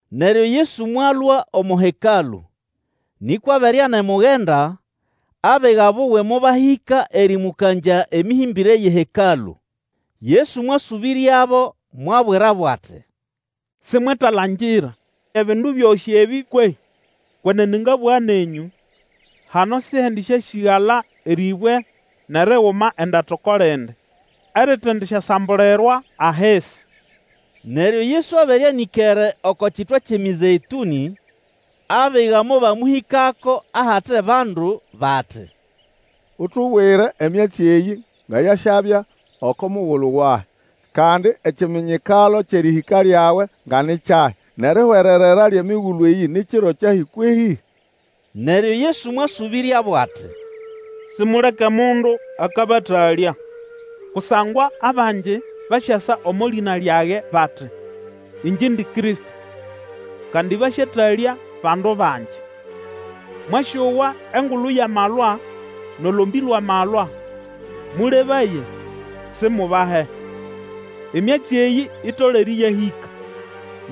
Neryo Yesu mwalũa omo Hekalũ, nĩkwa abere anemugenda, abiga buwe mobahĩka erĩmũkangya emĩhĩmbĩre yʼeHekalũ. Yesu mwasũbĩryabo mwabwirabo ati, Simwetalangira ebindu byosĩ ebĩ kwehĩ? Kwenene ngabũga nenyũ, hano sihendisyasĩgala erĩbwe nʼeriguma endata oko lindi, eritendisyasambulirwa ahisi. Neryo Yesu abere anĩkere oko kitwa kyʼeMĩzeĩtũnĩ, abiga mobamũhĩkako ahate bandu bati, Utubwire emyatsi eyĩ nga yasyabya oko mugulu wahi, kandi ekiminyikalo kyʼerĩhĩka lyawe nga ni kyahi, nʼerihwererera lyʼemigulu eyĩ ni kiro kyahi kwehĩ? Neryo Yesu mwasũbĩryabo ati, Simuleke mundu akabatalya. Kusangwa abangi basyasa omo lĩna lyage bati, Ĩngye indi Kristo, kandi basyatalya bandu bangi. Mwasyowa engulu yʼamalwa nʼolombĩ lwʼamalwa; mũlebaye, simubahe. Emyatsi eyĩ itolere ĩyahĩka,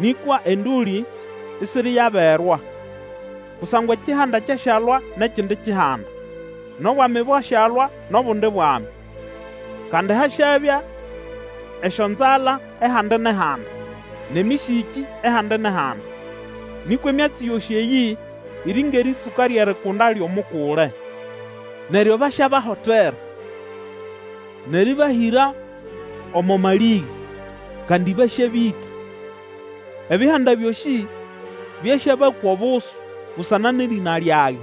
nĩkwa endũlĩ isiriyaberwa. Kusangwa ekihanda kyasyalwa nʼekindi kihanda, nʼobwami bwasyalwa nʼobundi bwami, kandi hasyabya esyonzala ehandi nʼehandi, nʼemĩsĩkĩ ehandi nʼehandi. Nĩkwa emyatsi yosĩ eyĩ iri ngʼerĩtsũka lyʼerikunda lyʼomukule. Neryo basyabahotera, nʼerĩbahĩra omo malĩge, kandi basyabĩta. Ebihanda byosĩ byasyabakwa obusu busana nʼerĩna lyage.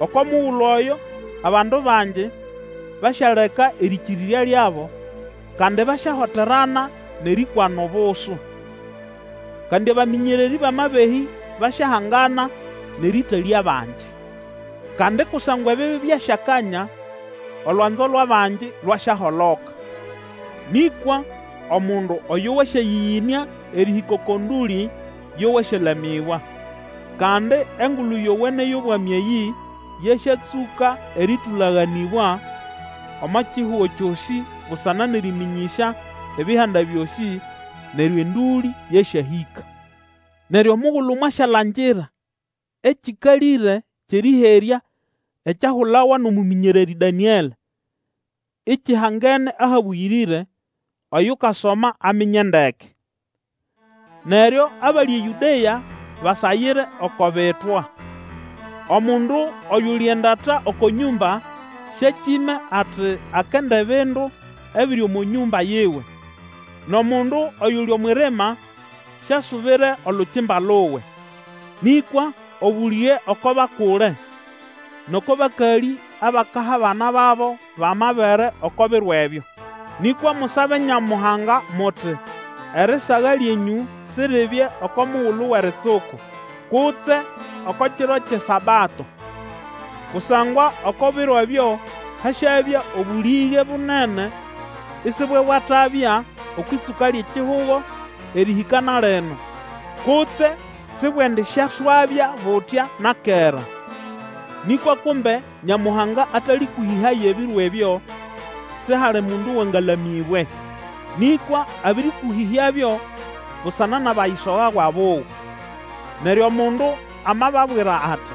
Oko mugulu oyo, abandu bangi basyaleka erĩkĩrĩrya lyabo, kandi basyahoterana nʼerĩkwana obusu. Kandi abamĩnyererĩ bʼamabehĩ basyahangana nʼerĩtalya abangi. Kandi kusangwa ebibi byasyakanya, olwanzo lwʼabangi lwasyaholoka. Nĩkwa omundu oyo wasyayĩyĩnĩa erĩhĩka oko ndũlĩ yo wasyalamĩbwa. Kandi Engulu Yowene yʼobwami eyĩ yasyatsũka erĩtũlaganĩbwa omo kihugo kyosĩ busana nʼerĩmĩnyĩsya ebihanda byosĩ, neryo endũlĩ yasyahĩka. Neryo omugulu mwasyalangira ekĩkalĩre kyʼerĩherya ekyahulawa nʼomũmĩnyererĩ Danĩelĩ, ikihangene ahabũyĩrĩre; oyukasoma aminye ndeke! Neryo abali eYũdea basagire oko bitwa. Omundu oyuli endata oko nyũmba, syakime ati, akenda ebindu ebiri omo nyũmba yiwe. Nʼomundu oyuli omwʼirima syasubire olukimba luwe. Nĩkwa obũlĩge oko bakule, nʼoko bakalĩ abakaha abana babo bʼamabere oko biro ebyo! Nĩkwa musabe Nyamuhanga muti erisaga lyenyũ siribye oko mugulu wʼeritsuku, kutse oko kiro kyʼeSabato. Kusangwa oko biro ebyo hasyabya obũlĩge bunene isibwebwatabya okwʼĩtsũka lyʼekihugo, erĩhĩka na lino, kutse sibwendisyaswabya butya na kera. Nĩkwa kumbe Nyamuhanga atalĩkũhĩhaya ebiro ebyo, sihali mundu wangalamĩbwe. Nĩkwa abĩrĩkũhĩhyabyo busana nʼabayisogawa buwe. Neryo omundu amababwira ati,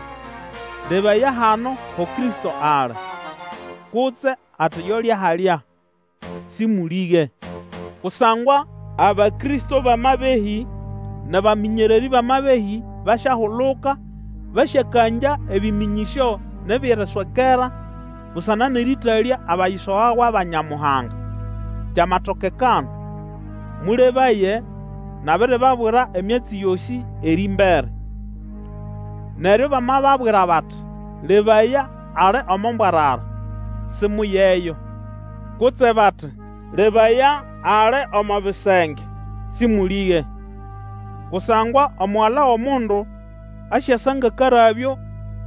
Lebaya, hano ho Kristo ali! Kutse ati, Yolya halya, Sĩmũlĩge. Kusangwa abakristo bʼamabehĩ nʼabamĩnyererĩ bʼamabehĩ basyahuluka basyakangya ebĩmĩnyĩsyo nʼebyʼeriswekera, busana nʼerĩtalya abayisogawa ba Nyamuhanga, kyamatokekana. Mũlebaye, nabiribabwira emyatsi yosĩ erĩmbere. Neryo bamababwira bati, Lebaya, ali omo mbwarara, simuyeyo. Kutse bati, Lebaya, ali omo bisenge, Sĩmũlĩge. Kusangwa Omugala wʼomundu asyasa ngʼakarabyo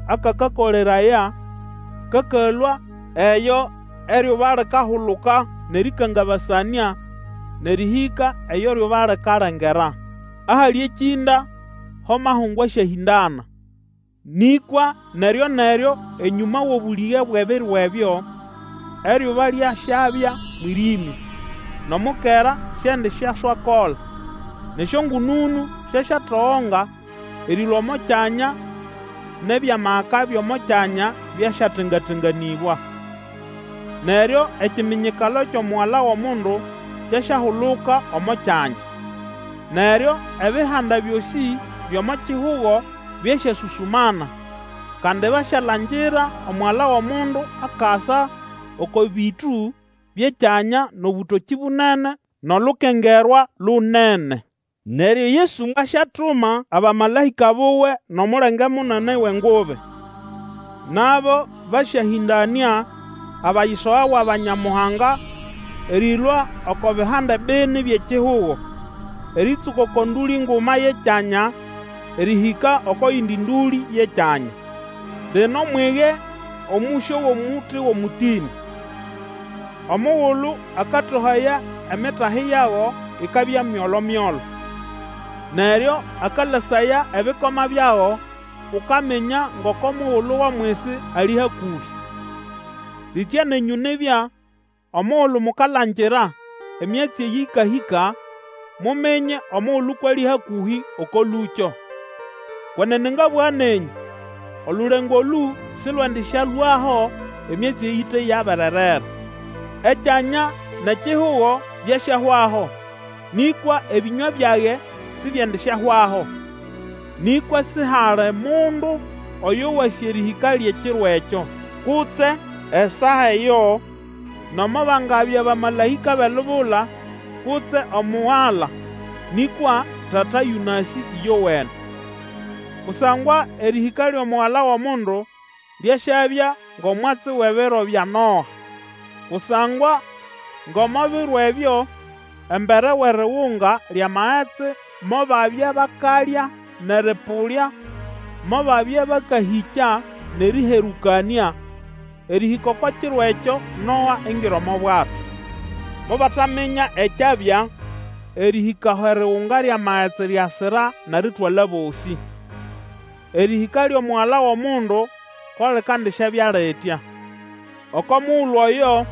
akakakoleraya kakalũa eyo eryuba likahuluka nʼerĩkangabasanĩa, nʼerĩhĩka eyo eryuba likalengera. Ahali ekĩnda, ho amahungu asyahĩndana. Nĩkwa neryo-neryo enyũma wʼobũlĩge bwʼebiro ebyo, eryuba lyasyabya mwĩrĩmya, nʼomukera siendisyaswakola, nʼesyongũnũnũ syasyatogonga erĩlũa omo kyanya, nʼebyʼamaka byʼomo kyanya byasyatenga-tenganĩbwa. Neryo ekiminyikalo kyʼomugala wʼomundu kyasyahuluka omo kyanya; neryo ebihanda byosĩ byʼomo kihugo byasyasũsũmana, kandi byasyalangira Omugala wʼomundu akasa oko bĩtũ byʼekyanya nʼobũtokĩ bunene nʼolukengerwa lunene. Neryo Yesu asyatuma abamalaĩka buwe nʼomulenge munene wʼengubi, nabo basyahĩndanĩa abayisogawa ba Nyamuhanga erĩlũa oko bihande bini byʼekihugo, erĩtsũka oko ndũlĩ nguma yʼekyanya erĩhĩka oko yindi ndũlĩ yʼekyanya. Lino mwige omũsyo wʼomuti wʼomũtĩnĩ. Omugulu akatohaya emitahi yago, ikabya myolo-myolo, neryo akalasaya ebikoma byago, Ukaminya ngoko mugulu wʼomwisi ali hakũhĩ. Litya nenyũ nibya, omugulu mukalangira emyatsi eyĩ ĩkahĩka, muminye omugulu kwʼali hakũhĩ, oko lũkyo. Kwenene ngabũga nenyũ, olulengo olũ sĩlwendĩsyalũaho emyatsi eyĩ ite yabererera. Ekyanya nʼekihugo byasyahwaho, nĩkwa ebĩnywa byage sibyendisyahwaho. Nĩkwa sihali mundu oyo wasĩ erĩhĩka lyʼekiro ekyo, kutse esaa eyo, nomo bangabya bamalaĩka bʼelubula, kutse Omugala, nĩkwa Tata yũnasĩ, ĩyowene. Kusangwa erĩhĩka lyʼomugala wʼomundu lyasyabya ngʼomwatsi wʼebiro bya Noa. Kusangwa ngʼomo biro ebyo embere wʼerigunga lyʼamagetsi, mobabya bakalya nʼerĩpũlya, mobabya bakahĩkya nʼerĩherũkanĩa, erĩhĩka oko kiro ekyo Noa ingira omo bwato. Mobataminya ekyabya erĩhĩka aho erigunga lyʼamagetsi lyasira nʼeritwala bosĩ. Erĩhĩka lyʼomugala wʼomundu ko likandisyabya litya. Oko mugulu oyo,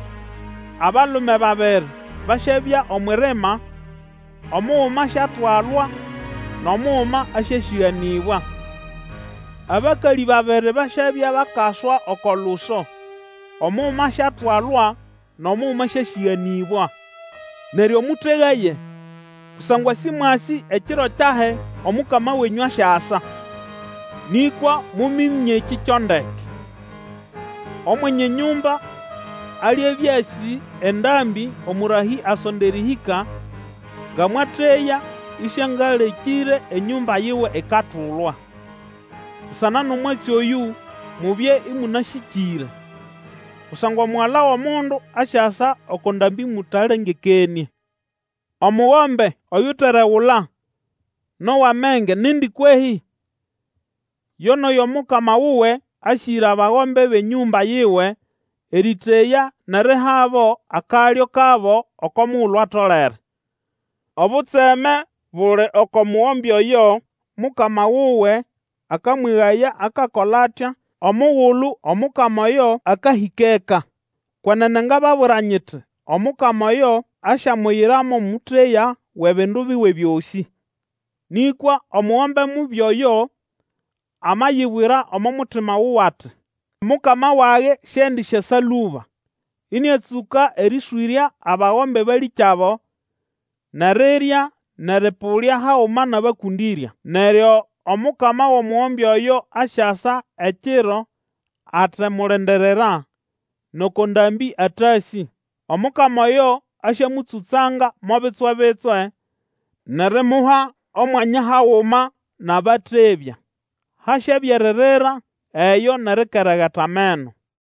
abalume babiri basyabya omwʼirima; omuguma asyatwalwa, nʼomuguma asyasĩganĩbwa. Abakalĩ babiri basyabya bakaswa oko luso, omuguma asyatwalwa, nʼomuguma asyasĩganĩbwa. Neryo mũtegaye! Kusangwa sĩmwasĩ ekiro kyahi Omukama wenyũ asyasa. Nĩkwa muminye ekĩ kyo ndeke, Omwenye nyũmba alibya asĩ esaa omũrahĩ asonda erĩhĩka, nga mwateya ĩsĩangalekĩre enyũmba yiwe ikatulwa. Busana nʼomwatsi oyũ mubye ĩmũnasĩkĩre, kusangwa Omugala wʼomundu asyasa oko ndambĩ mũtalengekenĩe. Omugombe oyuteregula nʼowʼamenge nindi kwehĩ? Yo nʼoyo mukama wuwe asĩgĩra bagombe bʼenyũmba yiwe erĩteya nʼerihabo akalyo kabo oko mugulu atolere. Obutseme buli oko mugombe oyo mukama wuwe akamwegaya akakola atya omugulu omukama oyo akahĩka eka. Kwenene ngababwira nyiti omukama oyo asyamuyira mo mũteya wʼebindu biwe byosĩ. Nĩkwa omugombe mubi oyo amayibwira omo mutima wuwe ati, Mukama wage siendisyasa lũba, ĩnĩatsũka erĩswĩrya abagombe balĩkyabo, nʼerirya, nʼerĩpũlya haguma nʼabakũndĩrya. Neryo omukama wʼomugombe oyo asyasa ekiro atemulindirira, nʼoko ndambĩ atasĩ. Omukama oyo asyamũtsũtsanga mo bitswe-bitswe, nʼerimuha omwanya haguma nʼabatebya. Hasyabya eririra eyo nʼerikeregeta ameno.